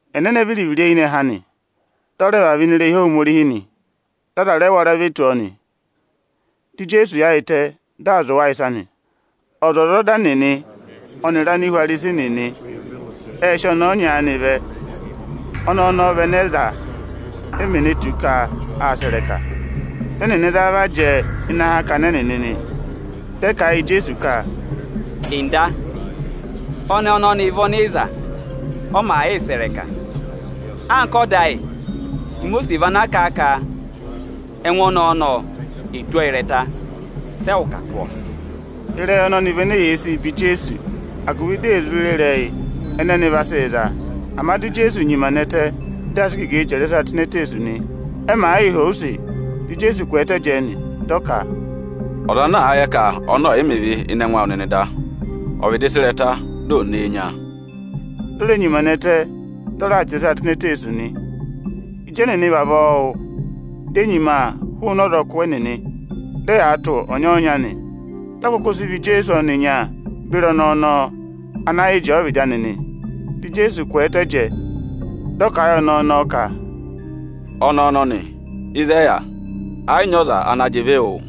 Ẹnẹnẹ viri-viri eyinẹhẹ anị, dị ọ rẹ vavẹ ini irehi Ohomorihi nị. Dị aza rẹ wara ve tù ọọ nị. Dị Ijeesu yaayịtẹ, dị aa zụ̀ wa ịsa nị. Ọzwọzọda nịnị ọnịrị Anihwarisi nịnị ệ sị ọnẹẹ ọnya aanị vẹ. Ọnẹẹ ọnọọ vị ẹnẹ ẹ za, e mè ne tù ka aa sẹ̀ ịrẹka. Dị ẹnịnị za a va jẹẹ ịnị akakana ẹnịnị nị. Dị ẹ kà a yị Ijeesu ka, “Ọga, ọnẹẹ ọnọnị vị ọnị ị za, ọ màa yịị sẹ̀ ịrẹka. Anka ọda ayị, Imosiisi vị ana kà a ka ẹngụ ọnẹẹ ọnọnị, asị ịrẹta-ịrẹta wụ ọ. Sị ẹwụ kà tụ̀ ọọ?” Ịrẹyị ọnọnị vị ene eyee sii be Ijeesu, agụvị di è zụ re ịrẹyị ẹnẹ ẹnị vaa sị za a. Ama di Ijeesu nyima nẹtẹ, dị aa sị igegee chẹrẹ ịsa tụ́ ini eteesu nị. Ẹ màa yịị họ̀ ọ use, dị Ijeesu kwẹẹtẹ jẹẹ nị, dị ọ ka, “Ọza ana àa yẹ ka ọnị ọọ̀ yị mẹ ịvị ịnị ẹngụ awụ nịnị da, ọ̀ vịdị sị ịrẹta, di ò nee nya a.” Di o re nyima nẹtẹ, dị ọ raa chẹrẹ ịsaa tụ́ ini eteesu nị. Ịjị ẹnịnị vavọọ wụ́, di e nyima hụụnị ọzọkụ ẹnịnị, dị ẹyaa tụ̀ ọnya-ọnya nị. Dị ọ kụkụ sị vọ Ijeesu ọnịnya beri ọnẹẹ ọnọọ ana yị jẹẹ ọvịdị anị nị. Dị Ijeesu kwẹẹtẹ jẹẹ, dị ọ kà a yị ọnẹẹ ọnọọ ka, “Ọnẹẹ ọnọnị, ịzị ẹ yà? Ẹ yị nyị ọza ana jị ịvị wụụ?”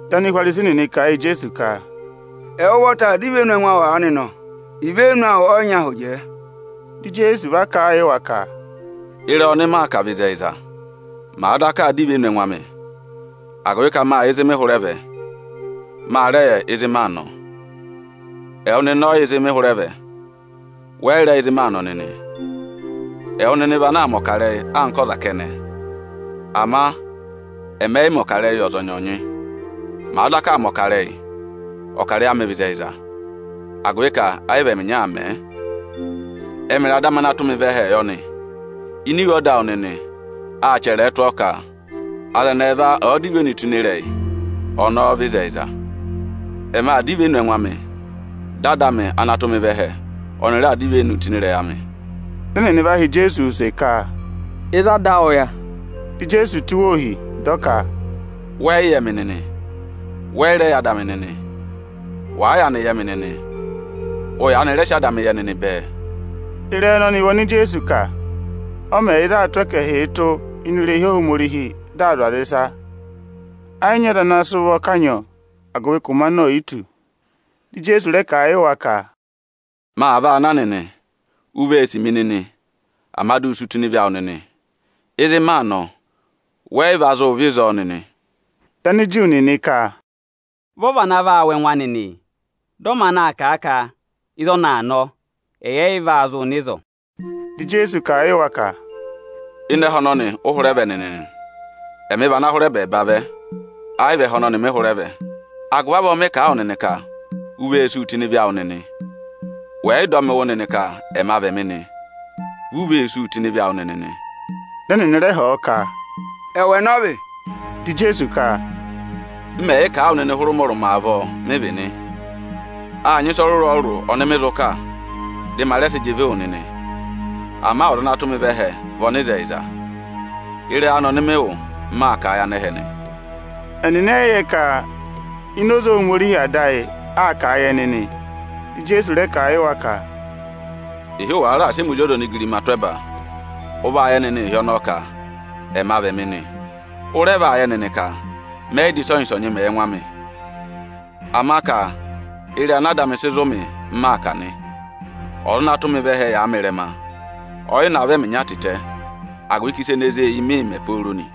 Dị Anihwarisi nịnị kà a yị Ijeesu ka, “Ẹwụ ụvọta aa dọ ivenu ẹngụ awụ aanị nọ! Ivenu awụ ọ yị nyị ahụ jẹẹ.” Dị Ijeesu va kà a yị wa ka, “Ịrẹyị ọnị maa kà vị ịzẹyịza, màa daka aa dọ ivenu ẹngụ amị, agụvị ka mâ yẹ ịzị mị hụrẹ vẹ, ma rẹ yẹ ịzị maa nọ. Ama ẹwụ nịnị ọ yị yẹ ịzị mị hụrẹ vẹ, wẹ yị rẹ yẹ ịzị maa nọ nịnị. Ẹwụ nịnị vị ana aa mẹ̀ ọkarẹyị anka ọza kẹnẹ. Ama ẹmị ẹ yị mẹ̀ ọkarẹyị yị ọzọnyị-ọzọnyị. Màa daka aa mẹ̀ ọkarẹyị, ọkarẹyị ẹmị vị ịzẹyịza, agụvị ka ẹ yị vị ẹmị ịnya aa mẹ̀ ẹ. Ẹmịrị Ada amị ana tụ́ mị vẹ ẹhẹẹ yọ nị. Ini iwe ọda awụ nịnị, â chẹrẹ ẹ tụ́ ọọ ka: ‘Aza ẹnị ẹẹva ẹ̀ẹ dọ ivenu tụ́ ịnị ịrẹyị, ịrẹyị ọnọọ vị ịzẹyịza.’ Ẹmị aa dọ ivenu ẹngụ amị, dị Ada amị ana tụ́ mị vẹ ẹhẹ, ọnị raa dọ ivenuu tụ́ ịnị ịrẹyị amị nị.” Dị ẹnịnị va họ̀ Ijeesu use ka, “Ịzị ada awụ yà?” Dị Ijeesu tụ́ wa ohi, dị ọ ka, “Wẹ yị yẹ mị nịnị, wẹ yị rẹ yẹ Ada amị nịnị. Wàa yaanị yẹ mị nịnị, ụ yaanị rẹ sị Ada amị yẹ nịnị bẹẹ.” Ịrẹyị ẹnẹnị vị oni Ijeesu kà, ọ mẹ yà ịzị aā tụ́ ẹkẹhịị tụ́ ini irehi Ohomorihi dị aa zụ̀ aza. Ẹ yị nyị ọza ana sị ụvọ kanyị ọọ, agụvị ka ụmẹ anị oò yi tù. Dị Ijeesu rẹ kà a yị wa ka, “Maa vaa na nịnị, u vee sì mi nịnị, ama di u sú tụ́ ịnị ịvị awụ nịnị. Ịzị maa nọ, wẹ yị va zụụ vẹ ịzọọ nịnị.” Dị Aniju nịnị ka, “Vị ọ́ọ́ vana vaa wụ̀ ẹngụ anị nị, dị ọ maanị aa kà a ka ịzị ọnị aa nọ, ẹyị ẹ yị va zụụ nọ ịzọọ nị?” Dị Ijeesu kà a yị wa ka, “Ịnị ẹhẹ ọnọnị ụ hụrẹ vẹ nịnị nị, ẹmị vị ana hụrẹ ẹbẹẹba vẹ, ẹ yị vị ẹhẹ ọnọnị ẹmị hụrẹ vẹ. Agụvị avọọ, mị kà a wụ nịnị ka u vee súu tụ́ ịnị ịvị awụ nịnị. Wẹ̀ yị dọ mị wụ́ nịnị ka ‘Ẹma vị Ẹmị’ nị, vi u vee súu tụ́ ịnị ịvị awụ nịnị nị.” Dị ẹnịnị rẹ họ̀ ọ ka, “Ẹwụ ẹnẹ ọ vị?” Dị Ijeesu ka, “M mẹ̀ yị kà a wụ nịnị hụrẹ ụmọrụmọ avọọ, mị vị nị. Â nyị ịsa ọrụrụ-ọrụrụ ọnị mị zụ kà, dị ma rẹ sị jị ịvị wụ nịnị. Ama Ọza ana tụ́ mị vẹ ẹhẹ vị ọnịzẹyịza. Ịrẹyị anị ọnị mị wụ́, m maa kà a yị anẹhẹ nị.” Ẹnịnị ẹ yị yẹ ka ini oze Ohomorihi Ada ayị aa kà a yị ẹnị nị. Dị Ijeesu rẹ kà a yị wa ka, “Ịhị wàa raà sị ẹmị Ozi ọza onigirima tụ́ ẹba, ụ vaa yẹ nịnị ịhị ọnọọ ka ‘Ẹma vị Ẹmị’ nị. Ụ rẹ vaa yẹ nịnị ka mẹ yị dà ịsọnyị-ịsọnyị mẹ yị ẹngụ amị, ama ka ịrẹyị ana Ada amị sị zụ̀ mị, m maa kà nị. Ọza ana tụ́ mị vẹ ẹhẹ yàa mị ịrẹma. Ọ yị navọ ẹmị ịnya tịtẹ, agụvị ka ịsa ene zé e eyi mịị̄ mẹ pooro nị.”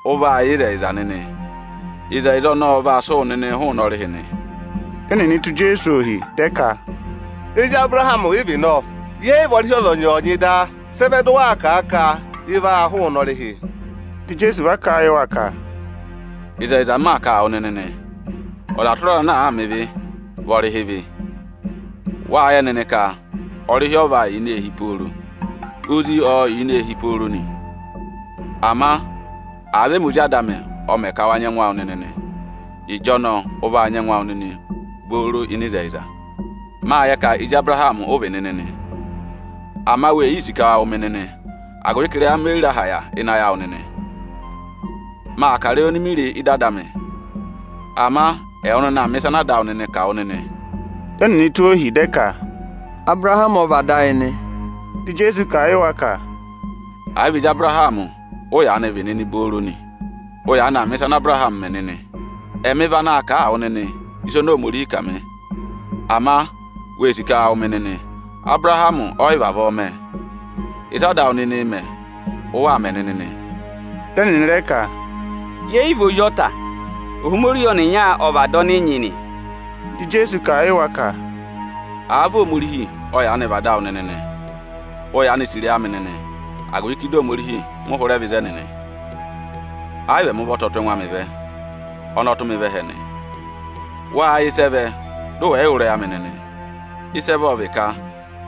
Ụ vaa yẹ ịzẹyịza nịnị; ịzẹyịza ọnọọ ọ vaa sị wụ nịnịị hụụnị ọrịhị nị.” Dị ẹnịnị tụ́ Ijeesu ohi, dị ẹ ka, “Ezi Abụrahamị ị vị nọ! Yẹẹ̀ yị vị ọrịhị ọzọnyị-ọzọnyị da. Sị ẹ vẹ dị ụ waa kà a ka: ị vaa hụụnị ọrịhị?” Dị Ijeesu va kà a yị wa ka, “Ịzẹyịza m maa kà a wụ nịnị nị, ọza tụra ọza ana àaā mẹ ịvị, vị ọrịhị ịvị. Wâ yẹ nịnị ka ọrịhị ọ yị vaa yà ini eehi pooro. Ozi ọọ̄ yà ini eehi pooro nị. Ama àa vị ẹmị Ozi Ada amị ọ mẹ ka wa nyị ẹngụ awụ nịnị nị, ịjọnọọ ụ vaa nyị ẹngụ awụ nịnị obooro ịnị ịzẹyịza. Mâ yẹ ka ezi Abụrahamị ụ vị nịnị nị; ama wee yii sì ka wa wụ̀ mị nịnị, agụvị ka ịrẹyị amị o yi re aha yà ịnị ayị awụ nịnị. Maa kà ịrẹyị oni mi re ị́dị Ada amị, ama ẹwụ nịnị aa mẹ̀ ịsa ana ada ẹwụ nịnị kà wụ nịnị.” Dị ẹnịnị tụ́ ohi, dị ẹ ka, “Abụrahamị ọ vị ada ayị nị.” Dị Ijeesu kà a yị wa ka, “Àa vị ezi Abụrahamị ụ yaanị vị nịnị obooro nị, ụ yaanị aa mẹ̀ ịsa ana Abụrahamị mẹ nịnị. Ẹmị vị anaā kà a wụ nịnị ịsa oni Ohomorihi kà mị; ama wee sì ka wa wụ̀ mị nịnị. Abụrahamị ọ yị vavọọ mẹ. Ịsị ada awụ nịnịị̄ mẹ, ụ waa mẹ nịnị nị.” Dị ẹnịnị rẹ ka, “Yẹ yị vị ozi ọta, Ohomorihi ọnịnya ọ vị Ada ọnị ị nyị nị.” Dị Ijeesu kà a yị wa ka, “Àa vị Ohomorihi ọ yaanị vị Ada awụ nịnị nị, ụ yaanị sì ịrẹyị amị nịnị, agụvị ka ịdị Ohomorihi mị hụrẹ vẹ ịzẹnị nị. Ẹ yị vị ẹmị ụvọta ọ tụ́ ẹngụ amị vẹ; ọnị ọ tụ́ mị vẹ ẹhẹ nị. Wáá yẹ ịsị ẹ vẹ dị ụ wẹ̀ yị yẹ ịrẹyị amị nịnị? Ịsị ẹ vẹ ọ vị ka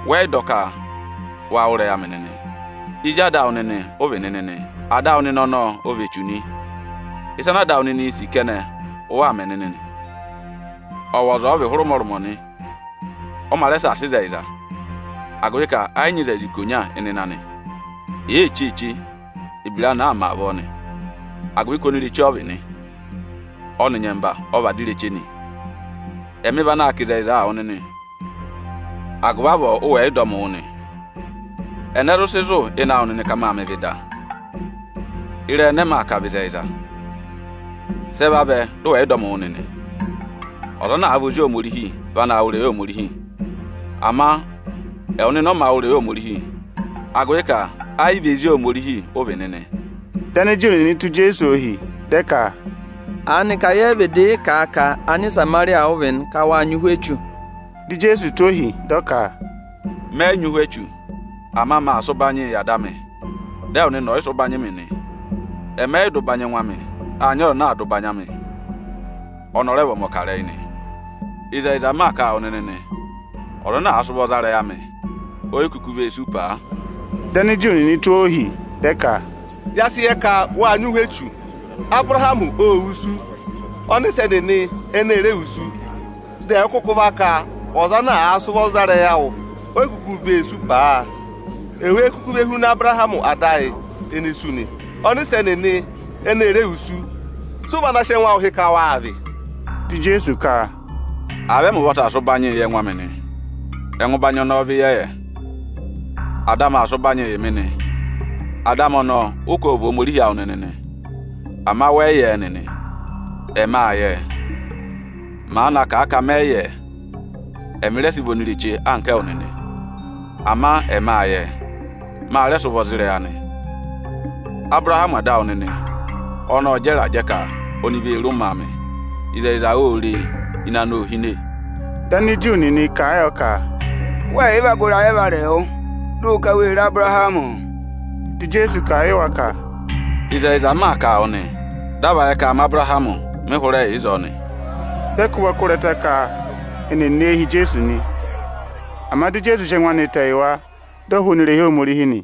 wẹ yị dọ ka wa wụ́ ịrẹyị amị nịnị. Ezi ada awụ nịnị ụ vị nịnị nị; ada awụ nịnị ọnọọ ọ vị Echu nị. Ịsa ana ada awụ nịnịị̄ sì kẹnẹ, ụ waa mẹ nịnị nị. Ọwọza ọ vị hụrẹ ụmọrụmọ nị. Ọ mā rẹ saasa ịzẹyịza, agụvị ka ẹ yị nyị ịzẹyịza ikonya ịnịnẹ anị. Èe cheeche, ebira anị aa mẹ avọọ nị, agụvị ka onireche ọ vị nị. Ọnị nyẹmba ọ vị ada ireche nị. Ẹmị vị anaā kà ịzẹyịza wụ nịnị, agụvị avọọ ụ wẹ̀ yị dọ mị wụ́ nị. Ẹnẹ zụ sị zụ̀ ịnị awụ nịnị ka mâ mẹ ịvị da? Ịrẹyị ẹnẹ ẹmị aa kà vị ịzẹyịza, sị ẹ vavẹ dị ụ wẹ̀ yị dọ mị wụ́ nịnị? Ọza ana àa vị ozi Ohomorihi vị anaā wụ́ ịrẹyị Ohomorihi; ama ẹwụ nịnị ọ mā wụ́ ịrẹyị Ohomorihi, agụvị ka ẹ yị vị ezi Ohomorihi ụ vị nịnị.” Dị Aniju nịnị tụ́ Ijeesu ohi, dị ẹ ka, “Aanịka yẹ yị vịdị yị kà a ka Anịsamarịya ụ vị nị, ka wâ nyị ụhwẹ echu?” Dị Ijeesu tụ́ ohi, dị ọ ka, “Mẹ yị nyị ụhwẹ echu, ama maa sị ụbanyịị yị Ada amị, dị ẹwụ nịnị ọ̀ yị sị ụbanyị mị nị. Ẹ yị vị ụbanyị ẹngụ amị m mee sì. Â nyị ọza enee si ụbanyịị yị mị, ọnị ọ rẹ vị ọmọkarẹyị nị. Ịzẹyịza m maa kà a wụ nịnị nị, ọza ana àa sị ụvọ za ịrẹyị amị, o yi kuku vee sú paa.” Dị Aniju nịnị tụ́ ọọ ohi, dị ẹ ka, “Ya sị yẹ ka wâ nyị ụhwẹ echu. Abụrahamị ô wusu, ọnịsẹ nịnị ẹnị e re wusu; dị ẹwụ kụkụ va ka ọza ana àa sị ụvọ za ịrẹyị awụ, oyi kuku vee sú paa! Ewéé kuku ve huna Abụrahamị ada ayị, ene sú nị? Ọnịsẹ nịnị ẹnị e re wusu. Sị ụ vị ana sị ẹngụ awụ hị́ ka wáa vị?” Dị Ijeesu ka, “Àa vị ẹmị ụvọta aa sị ụbanyịị yị ẹngụ amị nị, ẹngụ ụbanyị ọnọọ vị ịyẹyẹ. Ada amị aa sị ụbanyịị yị mị nị. Ada amị ọnọọ ụ ka ộ vị Ohomorihi awụ nịnị nị. Ama wẹ yị yẹ ẹ nịnị, ẹmị â yẹ ẹ. Màa na kà a ka mẹ yị yẹ ẹ, ẹmị rẹ sị vị onireche anka ẹwụ nịnị. Ama ẹmị â yẹ ẹ, ma rẹ sị ụvọ za ịrẹyị anị. Abụrahamị ada awụ nịnị ọnị ộ jẹ ịrajẹ ka oni vee re ụmẹ amị. Ịzẹyịza ô re e, ịnẹ anị ô hine.” Dị Aniju nịnị kà a yọ ka, “Wẹẹ̀ yị va gụ ịrayị ẹvarẹwụ, dị ụ ka wê re Abụrahamị?” Dị Ijeesu kà a yị wa ka, “Ịzẹyịza m maa kà a wụ nịnị nị, dị a va yẹ ka aa ma Abụrahamị, mị hụrẹ yà ịzọọ nị.” Dị ẹ kụ́ ụvọ kụ́ ịrẹta, ka eni è ne e hi Ijeesu nị, ama dị Ijeesu sị ẹngụ anị tẹ yị wa, di o hụụnị irehi Ohomorihi nị.